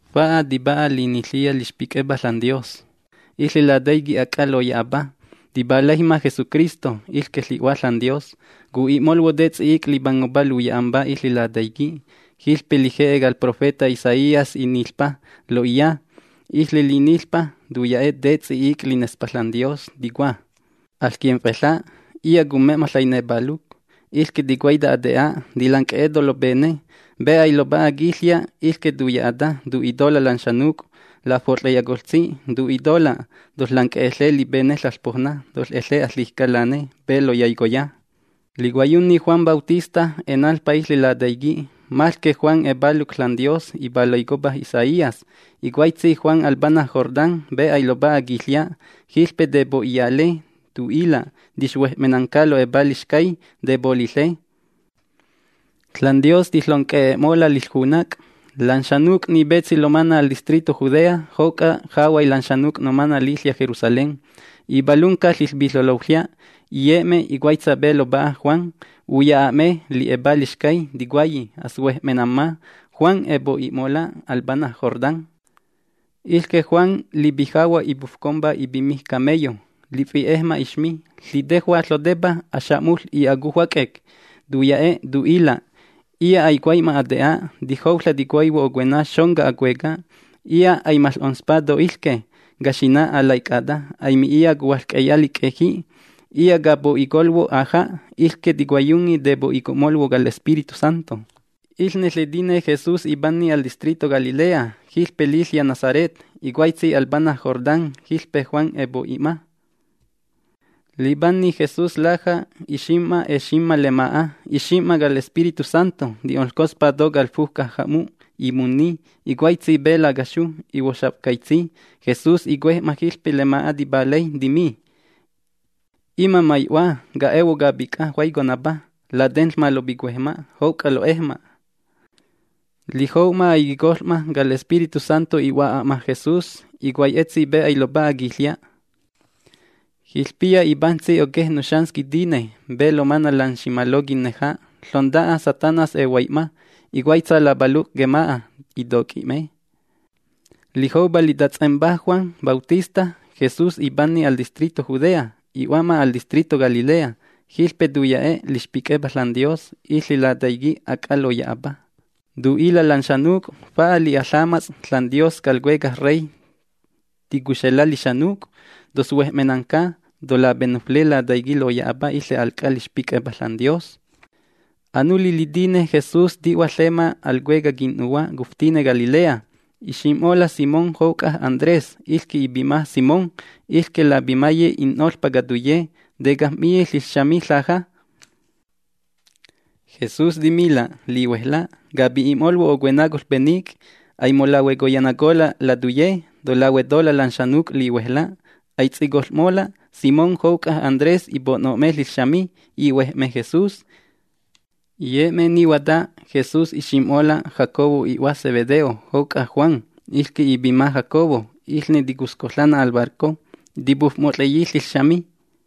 Fa'a tipa'a liniƚiya lixpic'epa ȽanDios. Iƚe lataiqui' ac'a loya'apa, tipalaijma Jesucristo, iƚque ƚi'Hua ȽanDios. Cu'i'molhuo' te ts'i'ic' lipangopa luya'ampá iƚe lataiqui'. Jiƚpe lije'e cal profeta Isaías iniƚijmpa lo'iya. Iƚe liniƚpa tuya'e' te ts'i'ic' linespa ȽanDios, ticua: ¡Aƚquimf'eƚa'! Iya' cumme'ma ƚainepaluc, iƚque ticuaita ate'a, tilanc'e'eto' lopene. Pe ailopa'a quiƚya' iƚque tuya'ata, tu'itola' lan xanuc' lafot'ƚeyacoƚtsi, tu'itola': “Toƚƚanc'e'eƚe lipene ƚaƚPoujna. Toƚ'e'eƚe aƚijca lane pe loyaicoya.” Licuaiyunni Juan Bautista enanƚpa iƚe lataiqui'. Maƚque Juan epaluc ȽanDios ƚipalaicopa Isaías. Icuaitsi Juan al pana' Jordán pe ailopa'a quiƚya'. Jiƚpe tepo'iyale. Tu'ila' tixhuej'menanca lo'epa lixcay. Tepoliƚe. ȽanDios tiƚonc'e'e'mola' liƚjunac'. Lan xanuc' ni petsi lomana' al distrito Judea, jouc'a jahuay lan xanuc' nomana' liƚya' Jerusalén, ipalunca ƚiƚpiƚeloƚya', iye'me, icuaitsa pe lopa'a Juan. Uya'a'me li'epa lixcay. Ticuayi: “Aƚsuej'menamma”. Juan epo'i'mola' al pana' Jordán. Iƚque Juan lipijahua' ipufcompa ipimij camello. Lifi'ejma ixmi. Ƚitejua' ƚotepa axa'muƚ y acujua c'ec. Tuya'e', tu'ila': ―Iya' aicuai'ma ate'a. Tijouƚa' ticuaihuo ocuena xonca acueca'. Iya' aimaƚ'onspa to iƚque, caxina alaic'ata, aimi'iya cuhuaƚc'eya lic'eji'. Iya' capo'icolhuo' aja', iƚque ticuaiyunni tepo'ico'molhuo' cal Espíritu Santo. Iƚne ƚitiné Jesús ipanni al distrito Galilea, jiƚpe liƚya' Nazaret. Icuaitsi al pana' Jordán jiƚpe Juan epo'i'ma. Lipanni Jesús laja', ixim'ma eximma lema'a, ixim'ma cal Espíritu Santo ti'onƚcospa to cal fujca ja'mu', imunni, icuaitsi pe lacaxu, ihuoxaf'caitsi. Jesús icuej'ma jiƚpe lema'a tipalay, timi: ―Ima' mai'Hua, ca'ehuo' capic'a juaiconapa. Latenƚma lopicuejma' jouc'a lo'ejma'. Lijou'ma aiquicoƚ'ma, cal Espíritu Santo i'hua'a'ma Jesús, icuaitsi pe ailopa'a quiƚya'. Jiƚpiya ipajntsi oquej nuxans quitine pe lomana' lan ximalo quinneja. Ƚonta'a Satanás ehuai'ma. Icuaitsa lapaluc' quema'a, itoc'i'me. Lijoupa litats'empa Juan Bautista, Jesús ipanni al distrito Judea. I'hua'ma al distrito Galilea. Jiƚpe tuya'e' lixpic'epa ȽanDios, iƚe lataiqui' ac'a loya'apa. Tu'ila' lan xanuc': ―Fa'a li'a ƚamats' ȽanDios cal Cuecaj Rey ticuxela' lixanuc'. Toƚsuej'menca. Tolapenufle Lataiqui' loya'apa iƚe al c'a lixpic'epa ȽanDios. Anuli litine Jesús ti'hua ƚema al cuecaj quin'nuhua' cuftine Galilea. Ixim'mola' Simón jouc'a Andrés, iƚque ipima Simón. Iƚne lapimaye in'noƚpá catuye, tecajm'miyi ƚiƚxami ƚaja. Jesús timila': ―¡Lihuejla'! Capi'i'molhuo' ocuena coƚpenic'. Aimolahueconayacola' latuye. Tolahuetola' lan xanuc' lihuejla'. Aits'icoƚ'mola'. Simón jouc'a Andrés ipo'no'me ƚiƚxami. Ihuej'me Jesús. Iye'me nihuata, Jesús ixim'mola' Jacobo i'hua Zebedeo, jouc'a Juan, iƚque ipima Jacobo. Iƚne ticusc'oƚanna al barco, tipufmot'ƚeyi ƚiƚxami.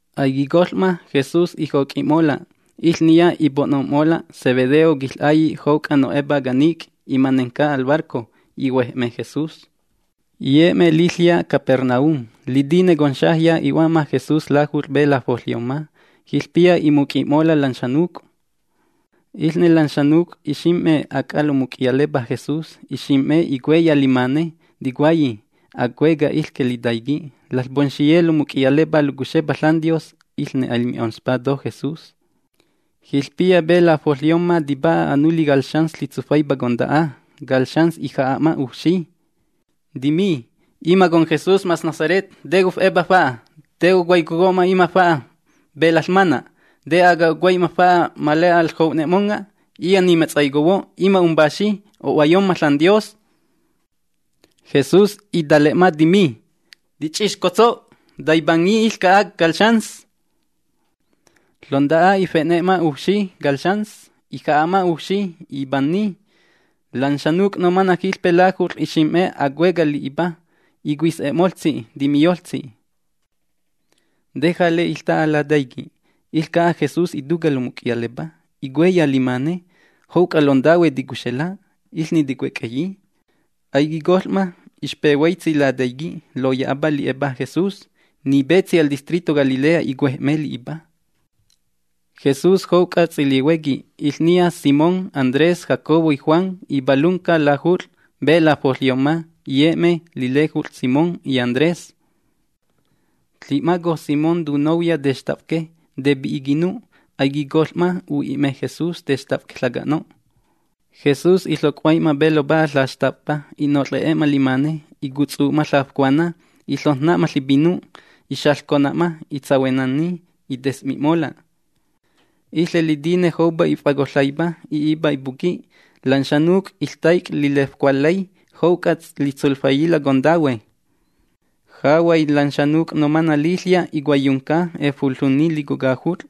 Aiquicoƚ'ma, Jesús ijoc'i'mola'. Iƚniya ipo'nom'mola' Zebedeo quiƚ'ailli' jouc'a no'epá canic' imanenca al barco. Ihuej'me Jesús. Iye'me liƚya' Capernaum. Litine conxajya i'hua'ma Jesús lajut'ƚ pe lafoƚyomma. Jiƚpiya imuc'i'mola' lan xanuc'. Iƚne lan xanuc' ixim'me ac'a lomuc'iyalepa Jesús, ixim'me icueya limane. Ticuayi: ―Acueca' iƚque litaiqui'. Laƚpomxiye nomuc'iyalepá locuxepa ȽanDios, iƚne aimi'onƚspola' to Jesús. Jiƚpiya pe lafoƚyomma tipa'a anuli cal xans ƚitsufaipa conta'a. Cal xans ija'a'ma ujfxi. Timi: ―Ima' conJesús mas Nazaret, ¿te cof'epa? ¿Te cotsufaicomma ima' fa'a pe laƚmana'? ¿Te aga ocuai'ma fa'a ma le'a aƚjou'ne'monga'? Iya' nimetsaicohuo'. Ima' umPaxi, o'huayomma ȽanDios. Jesús itale'ma, timi: ―¡Ti‑ch'ixcotso'! ¡Taipanni iƚca'a cal xans! Ƚonta'a ife'ne'ma ujfxi cal xans, ija'a'ma ujfxi, ipananni. Lan xanuc' nomana' jiƚpe lajut'ƚ ixim'me acueca' li'ipa. Icuis'e'moltsi, timiyoltsi: ―¿Te jale iƚta'a lataiqui'? Iƚca'a Jesús ituca' lomuc'iyalepa. Icueya limane, jouc'a lontahue ticuxela', iƚne ticuec'eyi. Aiquicoƚ'ma. Ixpehuaitsi lataiqui' loya'apa li'epa Jesús. Ni petsi al distrito Galilea icuej'me li'ipa. Jesús jouc'a ts'ilihuequi, iƚniya Simón, Andrés, Jacobo y Juan, ipalunca lajut'ƚ pe lafoƚyomma, iye'me lilejut'ƚ Simón y Andrés. Ƚi'maco Simón tunouya textafque. Tepi'i quipinu'. Aiquicoƚ'ma, u'i'me Jesús textafque ƚaca'no'. Jesús iƚoc'huai'ma pe lopa'a ƚaxtafpa. I'noƚ'e'ma limane. Icutsu'ma ƚafcuana. Iƚojn‑na'ma ƚipinu'. Ixaƚcona'ma. Itsahuenanni, ites'mi'mola'. Iƚe litine joupa if'acoƚaipa i'ipa ipuqui', lan xanuc' iƚtaic' lilefcualƚay, jouc'a litsuflaiyila' contahue. Jahuay lan xanuc' nomana' liƚya' icuaiyunca, efoƚunni lico lajut'ƚ.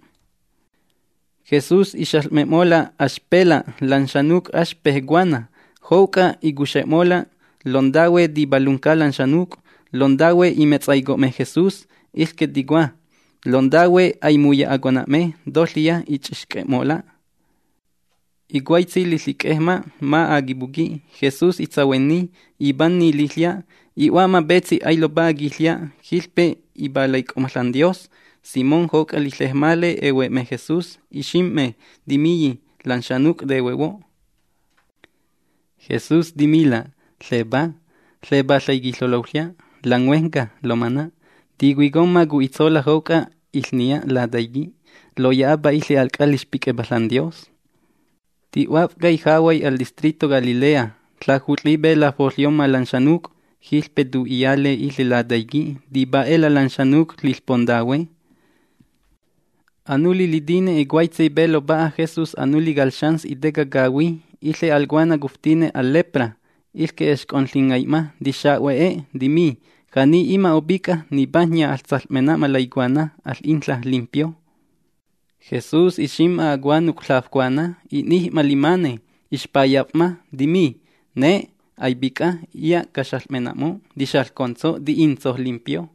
Jesús ixaƚ'mena'mola' axpela' lan xanuc', axpej cuana. Jouc'a icuxe'mola' lontahue tipalnanca lan xanuc'. Lontahue imetsaico'me Jesús. Iƚque ticua: “Lontahue aimuya'acona'me”. Toƚiya i‑ch'ixc'e'mola'. Icuaitsi liƚic'ejma ma' aquipuqui', Jesús itsahuenni, ipanni liƚya', i'hua'ma petsi ailopa'a quiƚya'. Jiƚpe ipalaic'o'ma ȽanDios. Simón jouc'a liƚejmale ehue'me Jesús. Ixim'me, timiyi: ―Lan xanuc' tehuehuo'. Jesús timila': ―Ƚepá. Ƚepá ƚaiquiƚeloƚya' lan huejnca lomana'. Ticuicomma cu'itsola' jouc'a iƚniya Lataiqui' loya'apa iƚe al c'a lixpic'epa ȽanDios. Ti'huaf'cay jahuay al distrito Galilea, ƚajut'ƚi pe lafoƚyomma lan xanuc', jiƚpe tu'iyale iƚe Lataiqui'. Tipa'e'ela' lan xanuc' liƚpontahue. Anuli litine icuaitsi pe lopa'a Jesús anuli cal xans iteca cahuí, iƚe al cuana cuftine al lepra. Iƚque exc'onƚingai'ma. Tixahue'e, timi: ―Ja'ni ima' opic'a, nipajnya aƚsaƚ'mena'ma laicuana. Aƚ'inƚa' limpio. Jesús ixim'ma acuanuc' ƚafcuana. I'nij'ma limane. Ixpayaf'ma, timi: ―Ne', aipic'a. Iya' caxaƚ'me'mo'. ¡Tixaƚcontso'! ¡Ti'intso' limpio!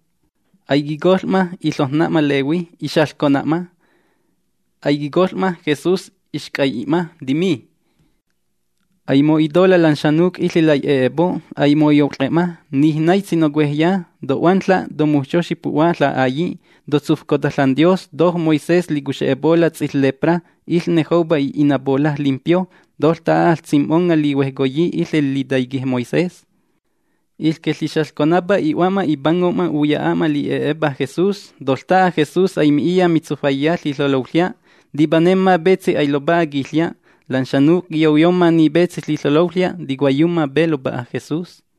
Aiquicoƚ'ma, iƚojn‑na'ma lehui, ixaƚcona'ma. Aiquicoƚ'ma, Jesús ixc'ai'i'ma, timi: ―Aimo'itola' lan xanuc' iƚe lai'e'epo'. Aimoyout'ƚe'ma. Nij naitsi nocuejya. To'huanƚa', tomujxoxi pu'hua ƚa'ailli'. Totsufcota ȽanDios to Moisés licuxe'epola' ts'iƚƚepra, iƚne joupa i'inapola' limpio. Toƚta'a aƚsim'monga' lihuejcoyi iƚe litaiqui' Moisés. Iƚque ƚixaƚconapa i'hua'ma, ipango'ma uya'a'ma li'e'epa Jesús. Toƚta'a Jesús aimi'iya mitsufaiya ƚiƚeloƚya'. Tipanemma petsi ailopa'a quiƚya'. Lan xanuc' quiyouyomma ni petsi ƚiƚeloƚya', tiƚcuaiyumma pe lopa'a Jesús.